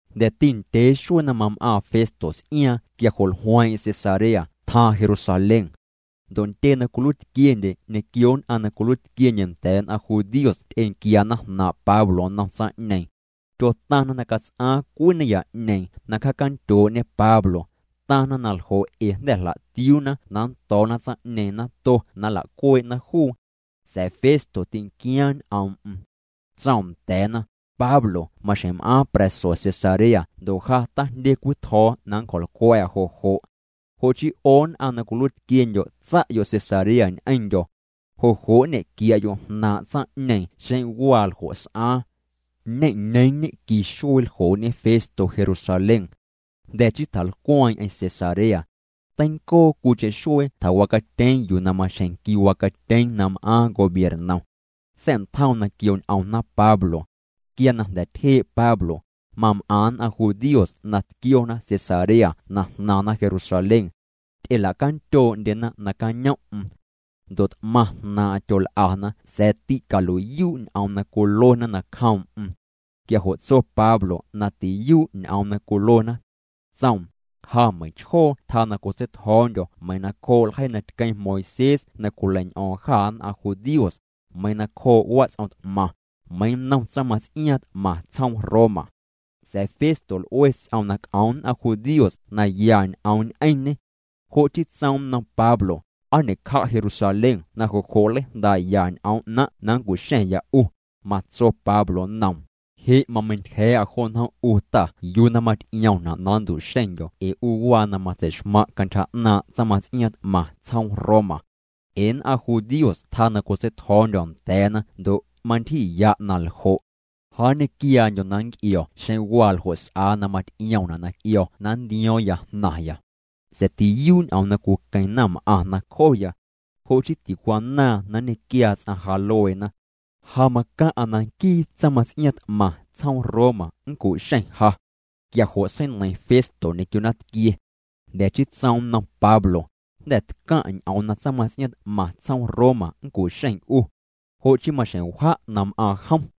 Jnda̱ti ndyee xuee na mam'aaⁿ Festo ts'iaaⁿ quia jo' jlueeⁿ'eⁿ Cesarea tjaaⁿ Jerusalén. Ndo' ntyee na cwiluiitquiendye ñequio nn'aⁿ na cwiluiitquiendye nda̱a̱ nn'aⁿ judíos ty'enquiana jnaaⁿ' Pablo nnom tsaⁿ'ñeeⁿ. Tyotaⁿna na cats'aaⁿ cwii naya'ñeeⁿ na cjaacandyoo'ñe Pablo. Taⁿna na ljo' ee jnda̱ jla'tiuuna na nndo̱o̱na tsaⁿ'ñeeⁿ nato na nla'cuee'na juu. Sa̱a̱ Festo tinquiaaⁿ ñ'oom'm. Tsoom nda̱a̱na: —Pablo maxjeⁿ m'aaⁿ pra̱so Cesarea ndo' ja tajndye cwii tjo̱o̱ na nncjo̱lcwa̱'a jo' jo'. Jo' chii 'o nn'aⁿ na cwiluiitquiendyo' tsa'yo' Cesarea ñ'eⁿndyo̱. Jo' jo' nñe'quia'yo' jnaaⁿ' tsaⁿ'ñeeⁿ xeⁿ waa ljo' s'aaⁿ. Ñe'ñeeⁿ ñe'qui xuee ljoo'ñe Festo Jerusalén. Jnda̱ chii tjalcweeⁿ'eⁿ Cesarea. Teincoo cwiicheⁿ xuee tjawacatyeeⁿ yuu na maxjeⁿ quiwacatyeeⁿ na m'aaⁿ gobiernom. Sa̱'ntjoom na quioñ'omna Pablo. Quia na jnda̱ tyjee' Pablo, mam'aⁿ nn'aⁿ judíos na tquiona Cesarea na jnaⁿna Jerusalén. Ty'ela'candyoo'ndyena nacañom'm. Ndo' t'maⁿ jnaaⁿ'aⁿ tyol'ana sa̱a̱ ticalui'yuu' ñ'oom na cwiluena nacjoom'm. Quia jo' tso Pablo na tiyuu' ñ'oom na cwiluena. Tsoom: —Ja meiⁿchjoo tjaa na cotseitjo̱o̱ndyo̱ meiⁿ na cjoo' ljeii na tqueⁿ Moisés na cwileiñ'o̱o̱ⁿ jâ nn'aⁿ judíos, meiⁿ na cjoo' wats'om t'maⁿ, meiⁿ nnom tsaⁿmaⁿts'iaaⁿ t'maⁿ tsjoom Roma. Sa̱a̱ Festo l'ue ts'oom na c'om nn'aⁿ judíos na ya ñ'oom ñ'eⁿñê. Jo' chii tsoom nnom Pablo: —¿Aa ñe'cja' Jerusalén na jo' jo' nleijndaa'ya ñ'oom 'naⁿ' na nncu'xa̱ⁿya 'u? Matso Pablo nnoom: —Je' mameintyja̱a̱'a jo njom' 'u ta yuu na maty'iomna' na nntu'xeⁿndyo̱ ee 'u waa na matsei'xmaⁿ' cantyja 'naaⁿ' tsaⁿmaⁿts'iaaⁿ t'maⁿ tsjoom Roma. Ee nn'aⁿ judíos tjaa na cotseitjo̱o̱ndyo̱ nda̱a̱na ndo' mantyji'ya' na ljo'. Ja nñequiaandyo̱ na nnc'io̱ xeⁿ waa ljo' s'aa na maty'iomna' na c'io̱ na nntio̱o̱ⁿya jnaⁿya. Sa̱a̱ tiyuu' ñ'oom na cwiqueⁿ naⁿm'aⁿ nacjoya. Jo' chii ticwanaaⁿ na nñequiaa ts'aⁿ ja lueena. Ja macaⁿ'a na nquii tsaⁿmaⁿts'iaaⁿ t'maⁿ tsjoom Roma nncu'xeⁿ ja. Quia jo' seineiⁿ Festo ñequio naⁿtquie. Jnda̱ chii tsoom nnom Pablo: —Jnda̱ tcaⁿ' ñ'oom na tsaⁿmaⁿts'iaaⁿ t'maⁿ tsjoom Roma nncu'xeⁿ 'u. Jo' chii maxjeⁿ wja' na m'aaⁿ jom.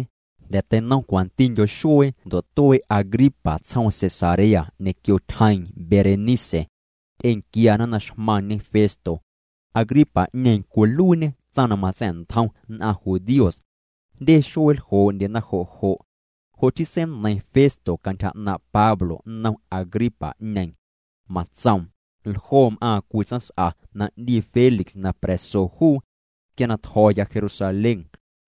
Jnda̱ teinom cwantindyo xuee ndo' tuee' Agripa tsjoom Cesarea ñequio tyjeeⁿ Berenice. Ty'enquiana na xmaⁿñe Festo. Agripa'ñeeⁿ cwiluiiñê tsaⁿ na matsa̱'ntjom nn'aⁿ judíos. Jndye xuee ljoo'ndyena jo' jo'. Jo' chii seineiⁿ Festo cantyja 'naaⁿ' Pablo nnom Agripa'ñeeⁿ. Matsoom: —Ljoo m'aaⁿ cwii tsaⁿs'a na 'ndii Félix na pra̱so juu. Quia na tjo̱ya Jerusalén,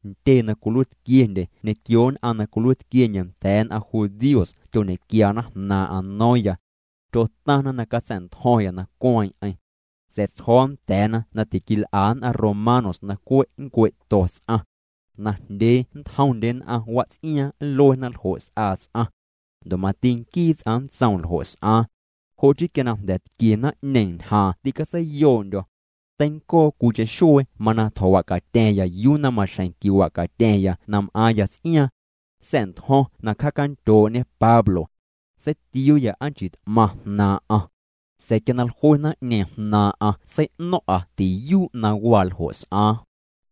ntyee na cwiluiitquiendye ñequio nn'aⁿ na cwiluiitquiendye nda̱a̱ nn'aⁿ judíos tyoñe'quiana jnaaⁿ'aⁿ no̱o̱ⁿya. Tyotaⁿna na catsa̱'ntjo̱ⁿya na cueeⁿ'eⁿ. Sa̱a̱ tsjo̱o̱ nda̱a̱na na tiquil'a nn'aⁿ romanos na cwe' nncue'to ts'aⁿ. Najndyee nntjomndye nn'aⁿ wats'iaaⁿ nluena ljo' s'aa ts'aⁿ. Ndo' mati nquii ts'aⁿ nntsoom ljo' s'aaⁿ. Jo' chii quia na jnda̱ tquie naⁿ'ñeeⁿ ñjaaⁿ tîcatseiyoo'ndyo̱. Teincoo cwiicheⁿ xuee mana tjo̱wa'catya̱ⁿya yuu na maxjeⁿ quiwa'catya̱ⁿya na m'aaⁿya ts'iaaⁿ. Sa̱'ntjo̱ⁿ na cjaacandyoo'ñe Pablo. Seitiuuya aa nchii t'maⁿ jnaaⁿ'aⁿ. Sa̱a̱ quia na jlue naⁿ'ñeeⁿ jnaaⁿ'aⁿ sei'no̱ⁿ'a tiyuu' na waa ljo' s'aaⁿ.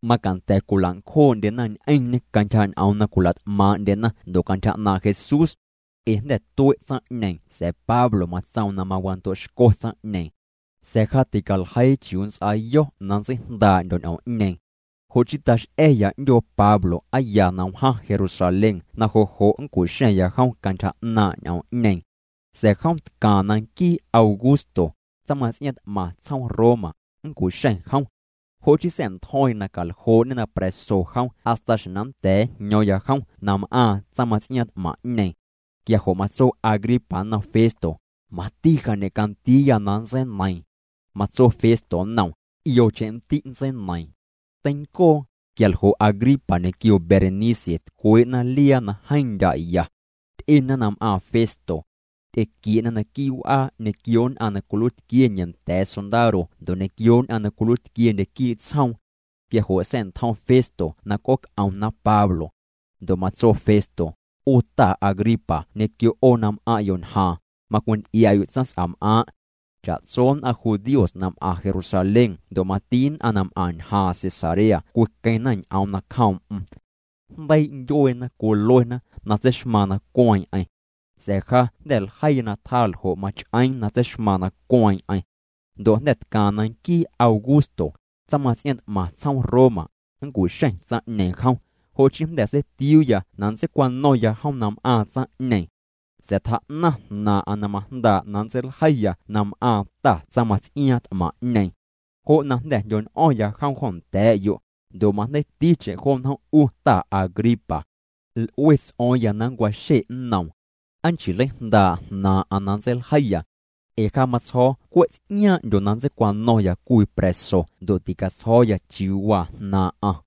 Macanda̱ cwila'ncjoo'ndyena ñ'eⁿñê cantyja ñ'oom na cwila't'maaⁿ'ndyena ndo' cantyja 'naaⁿ' Jesús. Ee jnda̱ tue' tsaⁿ'ñeeⁿ sa̱a̱ Pablo matsoom na mawando'xco tsaⁿ'ñeeⁿ. Sa̱a̱ ja ticaljeii chiuu nnts'aayo̱ na nntseijndaa'ndyo̱ ñ'oom'ñeeⁿ. Jo' chii tax'a̱ya 'ndyoo Pablo aa ya na wjaⁿ Jerusalén na jo' jo' nncu'xa̱ⁿya jom cantyja 'naaⁿ' ñ'oom'ñeeⁿ. Sa̱a̱ jom tcaaⁿ na nquii Augusto, tsaⁿmaⁿts'iaaⁿ t'maⁿ tsjoom Roma, nncu'xeⁿ jom. Jo' chii sa̱'ntjo̱ⁿya na caljoo'ñê na pra̱so jom hasta xjeⁿ na nnda̱a̱ njño̱o̱ⁿya jom na m'aaⁿ tsaⁿmaⁿts'iaaⁿ t'maⁿ'ñeeⁿ. Quia jo' matso Agripa nnom Festo: —Mati ja ñe'candiiya na nntseineiiⁿ. Matso Festo nnoom: —'Iocheⁿ nndi' nntseineiiⁿ. Teincoo, quia ljo' Agripa ñequio Berenice tcwee'na liaa na jeeⁿ ndya' ya. Ty'ena na m'aaⁿ Festo. Ty'equie'na naquii' w'aa ñequio nn'aⁿ na cwiluiitquiendye nda̱a̱ sondaro ndo' ñequio nn'aⁿ na cwiluiitquiendye quii' tsjoom. Quia jo' sa̱'ntjom Festo na c'ooc'omna Pablo. Ndo' matso Festo: —'U ta Agripa ñequio 'o na m'aⁿ'yo' ñjaaⁿ, macwinty'ia'yo' tsaⁿs'am'aaⁿ'. Cha'tso nn'aⁿ judíos na m'aⁿ Jerusalén ndo' mati nn'aⁿ na m'aⁿ ñjaaⁿ Cesarea cwiqueⁿna ñ'oom nacjoom'm. Jndeii' ndyueena cwiluena na tseixmaaⁿ na cueeⁿ'eⁿ. Sa̱a̱ ja jnda̱ ljeiya na tjaa ljo' mach'eeⁿ na tseixmaaⁿ na cueeⁿ'eⁿ. Ndo' jnda̱ tcaaⁿ na nquii Augusto, tsaⁿmaⁿts'iaaⁿ t'maⁿ tsjoom Roma, nncu'xeⁿ tsaⁿ'ñeeⁿ jom. Jo' chii jnda̱ seitiuuya na nntseicwano̱ⁿya jom na m'aaⁿ tsaⁿ'ñeeⁿ. Sa̱a̱ tjaa'naⁿ jnaaⁿ'aⁿ na majndaa' na nntseiljeiya na m'aaⁿ ta tsaⁿmaⁿts'iaaⁿ t'maⁿ'ñeeⁿ. Jo' na jnda̱ jndyo̱ñ'o̱ⁿya jom jo nda̱a̱'yo', ndo' majndeiiticheⁿ jo njom' 'u ta Agripa. L'ue ts'o̱o̱ⁿya na nncwaxe' nnoom. Aa nchii nleijndaa' jnaaⁿ'aⁿ na nntseiljeiya. Ee ja matsjo̱o̱ cwe' ts'iaaⁿ'ndyo na nntseicwano̱ⁿya cwii pra̱so ndo' ticatsjo̱o̱ya chiuu waa jnaaⁿ'aⁿ.